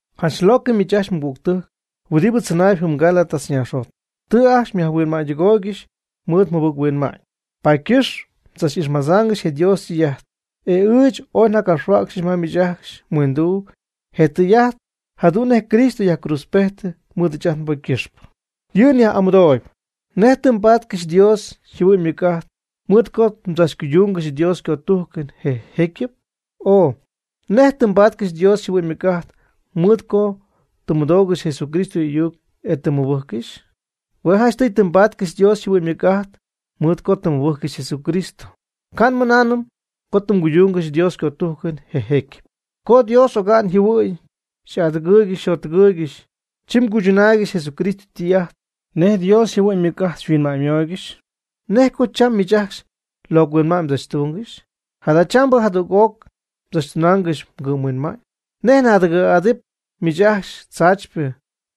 Janch locɨ miich ajcxy mɨgügtɨjc huɨdibɨ tzɨnaayb jɨm Gálatas naaxjot. Tɨ jäy ajcxy xyajhuinma'ñydɨgooygɨxy mɨɨd jɨbɨc-huinma'ñ. Paady ycɨxp mdzach'ixmadzaangɨxy je Dios ytɨy'ajt. Ɨɨch oy njacapxhuäcxyɨch ma miich ajcxy mhuinduu je tɨy'ajt jadu'n nej Cristo yajcruudzpejtɨ mɨɨd ɨɨch ajt nbocy ycɨxpɨ. Yɨ' nyaj'amɨdooyb: ¿Nej tɨ mbaatcɨxy Dios yjɨhuɨ'ñ ymɨc'ajt mɨɨd co mdzachcuyduunɨ Dios ycötujcɨn je jecyɨp? o ¿Nej tɨ mbaatcɨxy Dios yjɨhuɨ'ñ ymɨc'ajt mɨɨd co tɨ mmɨdoogɨxy Jesucristo y'ayuc e tɨ mmɨbɨjccɨxy? Hue' janchtɨy tɨ mbatcɨxy Dios yjɨhuɨ'ñ ymɨc'ajt co tɨ mmɨbɨjccɨxy Jesucristo, ca' nmɨnaanɨm co tɨ mguydungɨxy Dios ycötujcɨn je jecyɨp. Co Dios oga'n yjɨhuɨ'ñ xy'adɨgɨɨygɨxy xyjottɨgɨɨygɨxy, chi mguychɨnaaygɨxy Jesucristo ytɨy'ajt nej Dios yjɨhuɨ'ñ xyhuinma'ñymooygɨxy. ¿Nej co cham miich ajcxy mlocɨ huinma'ñ mdzachtungɨxy? Jadachambɨ jadüg'oc mdzachtunaangɨxy mgɨ'mhuinma'ñ. ¿Nej naadɨgɨ̈gɨ́xpɨ miich ajcxy tzaachypɨ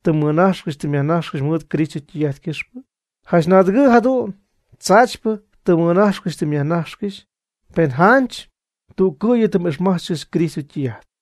tɨ mmɨnajxcɨxy tɨ myajnajxcɨxy mɨɨd Cristo ytɨy'ajt ycɨxpɨ? Janch naadɨgɨ' jadu'n tzaachypɨ tɨ mmɨnajcxcɨxy tɨ myajnajxcɨxy, pen janch tüccɨ̈yɨ tɨ m'ixmájtzcɨxnɨ Cristo ytɨy'ajt.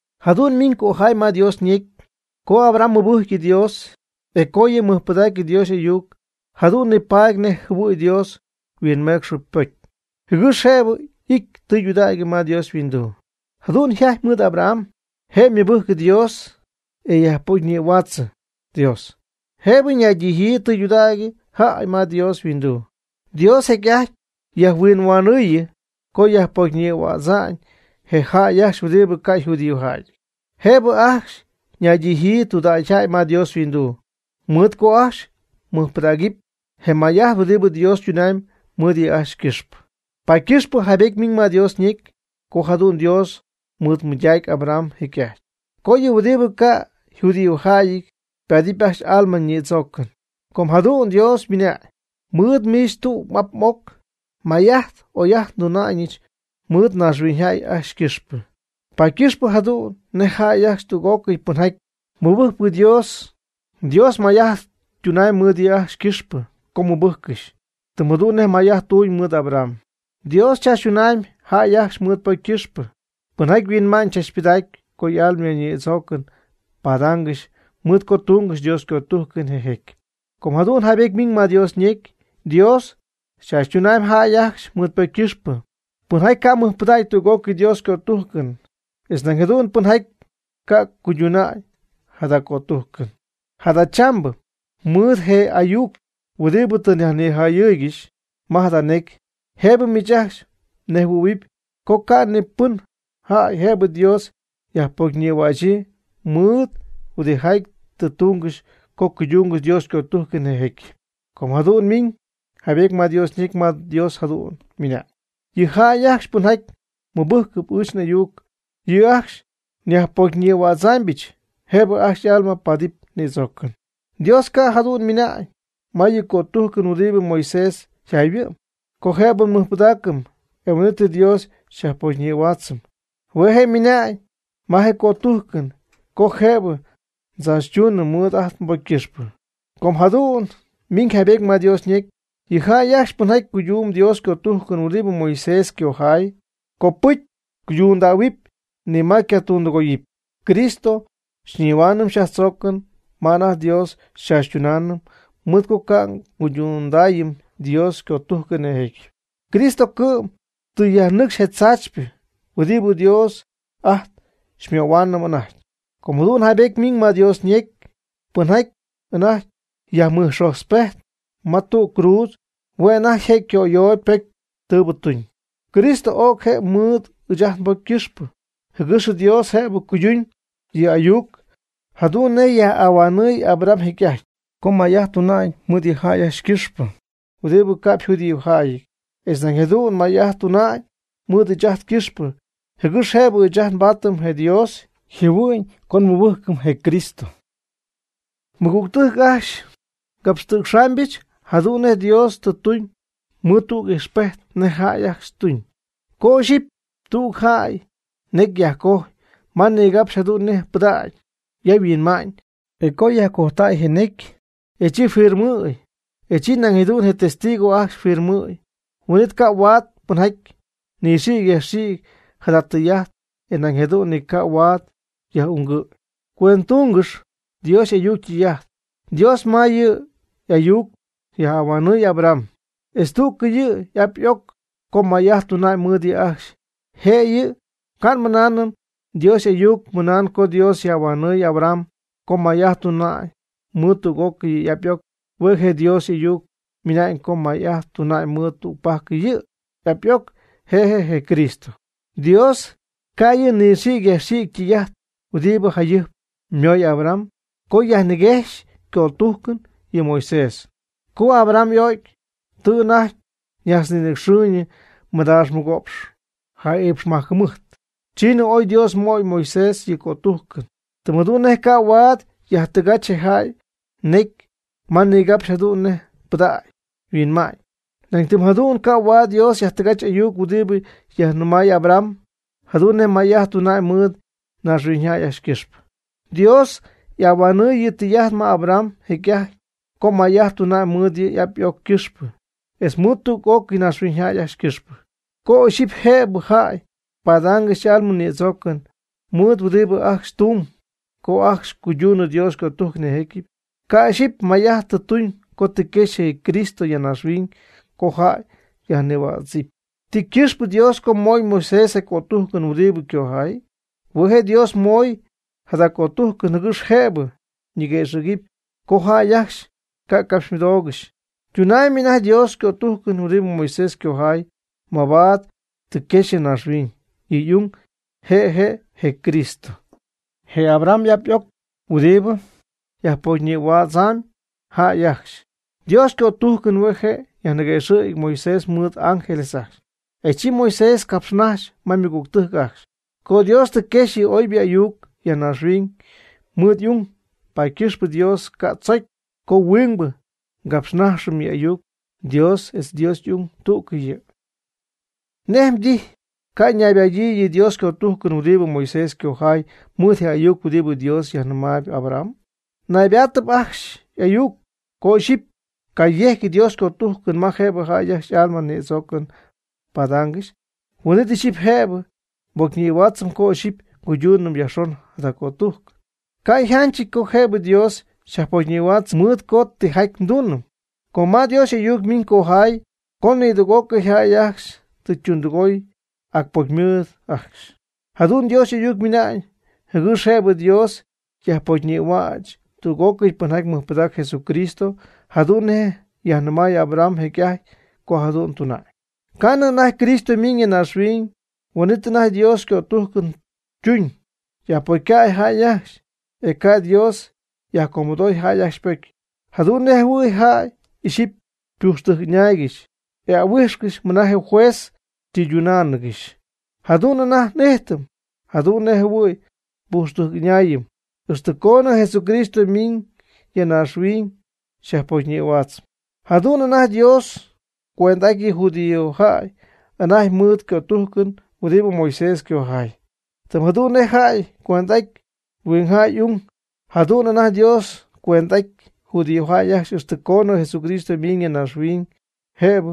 Jadu'n ymiñ cojay ma Dios ñecy co Abraham mɨbɨjcy Dios, e co yɨ' mɨjpɨdacy Dios y'ayuc jadu'n nipaady nej jɨhuɨ̈y Dios yhuinmecxɨ ypocy, jɨgɨx jëbɨ y'ity tudägy ma Dios yhuinduu. Jadu'n yjajty mɨɨd Abraham. Je' ymɨbɨjc Dios, e yajpocyñïhuaatzɨ Dios, jëbɨ ñaydijyii tudägy jäy ma Dios yhuinduu. Dios jecy'ajty yajnihuinmayɨɨy co yajpocyñïhuädza'ñ je jäy ajcxy huɨdibɨ ca' yjudíojäyɨty, jëbɨ ajcxy ñaydijyii tudägy jäy ma Dios yhuinduu, mɨɨd co ajcxy mɨjpɨdägɨpy je may'ajt huɨdibɨ Dios ytunamyb mɨɨd yɨ' ajcxy ycɨxpɨ. Paady ycɨxpɨ jaaybety ymiñ ma Dios ñecy co jadu'n Dios mɨɨdmɨydac Abraham jecy'ajty co yɨ huɨdibɨ ca' yjudíojäyɨty ypaadɨpy ajcxy y'alma nïdzoocɨn, com jadu'n Dios ymɨnañ: “Miid miich tüg m'ap m'oc may'ajt oy'ajt nduna'ñɨch mɨɨd naaxhuiñyjäy ajcxy ycɨxpɨ.” Paady ycɨxpɨ jadu'n nej jäy ajcxy tüg'ócɨy pɨnjaty mɨbɨjcp Dios, Dios may'ajt tunamb mɨɨd yɨ' ajcxy ycɨxpɨ co mɨbɨjccɨxy, tɨm jadu'n nej may'ajt tuun mɨɨd Abraham. Dios chaachytunamy jäy ajcxy mɨɨd ypocy ycɨxpɨ, pɨnjaty huinma'ñ tzachpɨdacp co y'alma ñïdzoocɨn padaangɨxy mɨɨd co cuydungɨxy Dios ycötujcɨn je jecyɨp. Com jadu'n jaybety ymiñ ma Dios ñecy: “Dios chaachytunamyb jäy ajcxy mɨɨd ypocy ycɨxpɨ, pɨnjaty ca' mɨjpɨdägy tüg'ócɨy Dios ycötujcɨn, etz nañ jadu'n pɨnjaty ca' cuydundäy jada cötujcɨn.” Jadachambɨ mɨɨd je ayuc huɨdibɨ tɨ nyajnijayɨɨygɨxy ma jada necy, jëbɨ miich ajcxy mnejhuɨ̈huɨp co ca' ni pɨn jäy jëbɨ Dios yajpocyñïhuächyii mɨɨd huɨdijaty tɨ tungɨxy co cuydungɨxy Dios ycötujcɨn je jecyɨp. Com jadu'n ymiñ jaybety ma Dios ñecy ma Dios jadu'n ymɨna'ñ: “Yɨ jäy ajcxy pɨnjaty mɨbɨgɨp ɨɨch n'ayuc, yɨ' ajcxy nyajpocyñïhuädzaamybɨch jëbɨ ajcxy y'alma paadɨp ñïdzoocɨn.” Dios ca' jadu'n ymɨna'ñ ma yɨ' ycötujcɨn huɨdibɨ Moisés yjayhuɨ'm co jëbɨ nmɨjpɨdaacɨm, e huin'it Dios xyajpocyñïhuaatzɨm. Hue' je' ymɨna'ñ ma ycötujcɨn co jëbɨ xychaachytuunɨm mɨɨd ajt nbocy ycɨxpɨ. Com jadu'n ymiñ jaybety ma Dios ñecy: “Yɨ jäy ajcxy pɨnjaty cuydumb Dios ycötujcɨn huɨdibɨ Moisés ycojay, copɨcy cuydundähuɨp, ni ma ycatundɨgoyɨpy.” Cristo xyñihuaanɨm xyyajtzoocɨm ma anajty Dios xychaachytunaanɨm mɨɨd co ca' nguydundaayɨm Dios ycötujcɨn je jecyɨp. Cristo cɨ'm tɨ yajnɨcxy je tzaachypɨ huɨdibɨ Dios ajt xymöhuaanɨm anajty. Com jadu'n jaybety ymiñ ma Dios ñecy: “Pɨnjaty anajty yajmɨjxotzpejtp ma tüg cruudz, hue' anajty je' yco'ayooyb ypocy tɨɨbɨ tuñ.” Cristo o'c je' mɨɨd ɨɨch ajt nbocy ycɨxpɨ, jɨgɨx Dios jëbɨ cuyduñ yɨ' y'ayuc jadu'n nej yaj'ahuanɨɨy Abraham jecy'ajty, co may'ajt tuna'ñ mɨɨd yɨ jäy ajcxy ycɨxpɨ huɨdibɨ ca'p yjudíojäyɨty, etz nañ jadu'n may'ajt tuna'ñ mɨɨd ɨɨch ajt ycɨxpɨ, jɨgɨx jëbɨ ɨɨch ajt nbaatɨm je Dios yjɨhuɨ'ñ co nmɨbɨjcɨm je Cristo. Mɨgügtɨjc ajcxy, ngapxtɨ̈cxaamybɨch jadu'n nej Dios tɨ tuñ mɨɨd tüg ijxpejt nej jäy ajcxy ytuñ. Co ixyipy tüg jäy necy yajcojy ma nigapxy jadu'n nej ypɨdägy yajhuɨ'ma'ñ, e co yajcojtäy je necy, e chi firmɨjɨ̈y, e nañ jadu'n je testigo ajcxy yfirmɨjɨ̈y, huin'it ca' huaad pɨnjaty nɨxïgy yajxïgy jada tɨy'ajt, e nañ jadu'n ni ca' huaad yaj'ungɨ̈y. Cuendɨtungɨxy Dios y'ayuc ytɨy'ajt, Dios ma yɨ' y'ayuc yaj'ahuanɨɨy Abraham etz tüg yɨ' y'ap y'oc co may'ajt tuna'ñ mɨɨd yɨ' ajcxy jëyɨ. Ca' nmɨnaanɨm Dios y'ayuc ymɨna'ñ co Dios yaj'ahuanɨɨy Abraham co may'ajt tuna'ñ mɨɨd tüg'ócɨy yɨ' y'ap y'oc. Hue' je'Dios y'ayuc ymɨna'ñ co may'ajt tuna'ñ mɨɨd tügpajc yɨ' y'ap y'oc, je' je' je Cristo. Dios ca' yɨ' nɨxïgy yajxïgy ytɨy'ajt huɨdibɨ jayɨjp ymoy Abraham co yajniguejxy ycötujcɨn yɨ Moisés. Co Abraham y'o'cy, tɨ anajty ñajtznïnɨcxɨɨyñɨ mɨdaax mɨgo'px ja'iipxmajc jɨmɨjt, chiinɨ oy Dios möy Moisés yɨ' ycötujcɨn. Tɨm jadu'n nej ca' huaad yajtɨgach je jäy ñecy ma nigapxy jadu'n nej ypɨdägy yajhuɨ'ma'ñ, nañ tɨm jadu'n ca' huaad Dios yajtɨgach y'ayuc huɨdi yajnɨmay Abraham jadu'n nej may'ajt tuna'ñ mɨɨd naaxhuiñyjäy ajcxy ycɨxpɨ. Dios y'ahuanɨɨy yɨ' ytɨy'ajt ma Abraham jecy'ajty co may'ajt tuna'ñ mɨɨd yɨ' y'ap y'oc ycɨxpɨ etz mɨɨd tüg'ocɨy naaxhuiñyjäy ajcxy ycɨxpɨ. Co ixyipy jëbɨ jäy padaangɨxy y'alma ñïdzoocɨn mɨɨd huɨdibɨ ajcxy ytumyb co ajcxy cuyduunɨ Dios ycötujcɨn je jecyɨp, ca' ixyipy may'ajt tɨ tuñ co tɨ quexy je Cristo ya naaxhuiñ co jäy yajnïhuädzɨp. ¿Ti ycɨxpɨ Dios co moy Moisés je cötujcɨn huɨdibɨ ycojay? Hue' je' Dios moy jada cötujcɨn jɨgɨx jëbɨ niguëxɨ̈gy co jäy ajcxy ca' ycapxymɨdoogɨxy. Tunamb anajty Dios ycötujcɨn huɨdibɨ Moisés ycojay mabaad tɨ quexy ya naaxhuiñ yɨ' y'ung, je' je' je Cristo, je Abraham y'ap y'oc huɨdibɨ yajpocyñïhuätzp jäy ajcxy. Dios ycötujcɨn hue je' yajniguejx Moisés mɨɨd ángeles ajcxy. E chi Moisés capxnajxy ma ymɨgügtɨjc ajcxy. Co Dios tɨ quexy yɨ' oybɨ y'ayuc ya naaxhuiñ mɨɨd y'ung, paady ycɨxpɨ Dios ca' tzocy co huingbɨ capxnaxɨpy yɨ' y'ayuc. Dios etz Dios y'ung tú'cɨy yɨ'. ¿Nej mdijy ca' ñaybadyii yɨ Dios ycötujcɨn huɨdibɨ Moisés ycojay, mɨɨd je ayuc huɨdibɨ Dios yajnɨmay Abraham? Naybaatɨp ajcxy y'ayuc. Co ixyipy cayejcy Dios cötujcɨn ma jëbɨ jäy ajcxy y'alma ñïdzoocɨn padaangɨxy, huin'it ixyipy jëbɨ nbocyñïhuaatzɨm co ixyipy nguyduunɨm yajxon jada cötujcɨn. Ca' yjanchɨty co jëbɨ Dios xyajpocyñïhuaatzɨm mɨɨd co tijaty nduunɨm. Com ma Dios y'ayuc ymiñ cojay co nidüg'ócɨy jäy ajcxy tɨ ytundɨgooy, ac pocy ymɨɨd ajcxy. Jadu'n Dios y'ayuc ymɨna'ñ, jɨgɨx jëbɨ Dios yajpocyñïhuäch tüg'ócɨy pɨnjaty mɨjpɨdacp Jesucristo, jadu'n nej yajnɨmay Abraham jecy'ajty co jadu'n tuna'ñ. Ca'nɨ anajty Cristo ymiñ ya naaxhuiñ, huin'it anajty Dios ycötujcɨn ytuñ, yajpocycäy jäy ajcxy, e ca' Dios yajcomɨdoy jäy ajcxy ypocy. Jadu'n nej jɨhuɨ̈y jäy ixyipy ypujxtɨjc'ɨñaaygɨxy e ahuijxcɨxy mɨna je juez ytɨydunáanɨgɨxy. Jadu'n anajty n'ijtɨm jadu'n nej jɨhuɨ̈y nbujxtɨjc'ɨñaayɨm, ixtɨ coonɨ Jesucristo ymiiñ ya naaxhuiñ yajpocyñïhuaatzp. Jadu'n anajty Dios cuend'aty yɨ judíojäy anajty mɨɨd ycötujcɨn huɨdibɨ Moisés ycojay. Tɨm jadu'n nej jäy cuend'aty huingjäy y'ung. Jadu'n anajty Dios cuend'aty judío jäy ajcxy ixtɨ coonɨ Jesucristo ymiiñ ya naaxhuiñ jëbɨ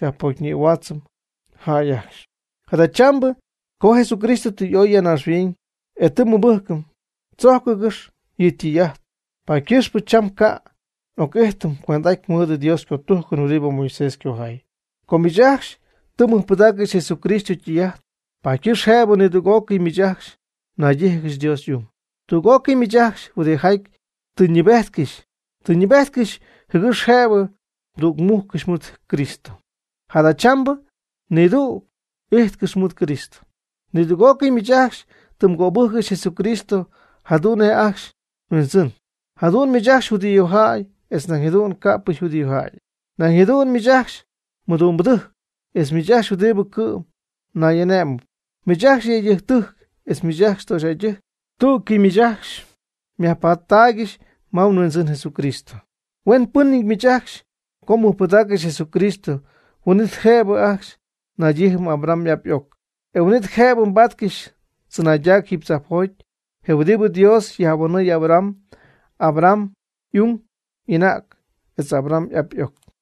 yajpocyñïhuäch jäy ajcxy. Jadachambɨ co Jesucristo tɨ y'oy ya naaxhuiñ, e tɨ nmɨbɨjcɨm (tzojcɨngɨ́x) yɨ' ytɨy'ajt, paady ycɨxpɨ cham ca' n'oc'ijtɨm cuend'aty mɨɨd Dios ycötujcɨn huɨdibɨ Moisés ycojay. Com miich ajcxy tɨ mmɨjpɨdaaccɨxy Jesucristo ytɨy'ajt, paady ycɨxp jëbɨ nidüg'ócɨy miich ajcxy naydíjɨgɨxy Dios y'ung. Tüg'ócɨy miich ajcxy huɨdijaty tɨ mnɨɨbejtcɨxy, tɨ mnɨɨbejtcɨxy jɨgɨx jëbɨ mdügmujccɨxy mɨɨd Cristo, jadachambɨ nïducy m'ijtcɨxy mɨɨd Cristo. Nidüg'ócɨy miich ajcxy tɨ mgöbɨjccɨxy Jesucristo jadu'n nej ajcxy mHuindzɨn. Jadu'n miich ajcxy judíojäy etz nañ jadu'n ca'pɨ yjudíojäyɨty, nañ jadu'n miich ajcxy mɨdumbɨdɨjc etz miich ajcxy huɨdibɨ cɨ'm nay'ane'mɨp, miich ajcxy yëydɨjctɨjc etz miich ajcxy töxyjäydɨjc; tú'cɨy miich ajcxy myajpattaaygɨxy ma mHuindzɨn Jesucristo. Huenpɨnɨty miich ajcxy co mmɨjpɨdaaccɨxy Jesucristo, huin'it jëbɨ ajcxy mnaydijɨɨyb Abraham y'ap y'oc, e huin'it jëbɨ mbáatcɨxɨpy tzɨnaydac jiiby tzajpjoty, je huɨdibɨ Dios yaj'ahuanɨɨy Abraham, Abraham y'ung y'anäg etz Abraham y'ap y'oc.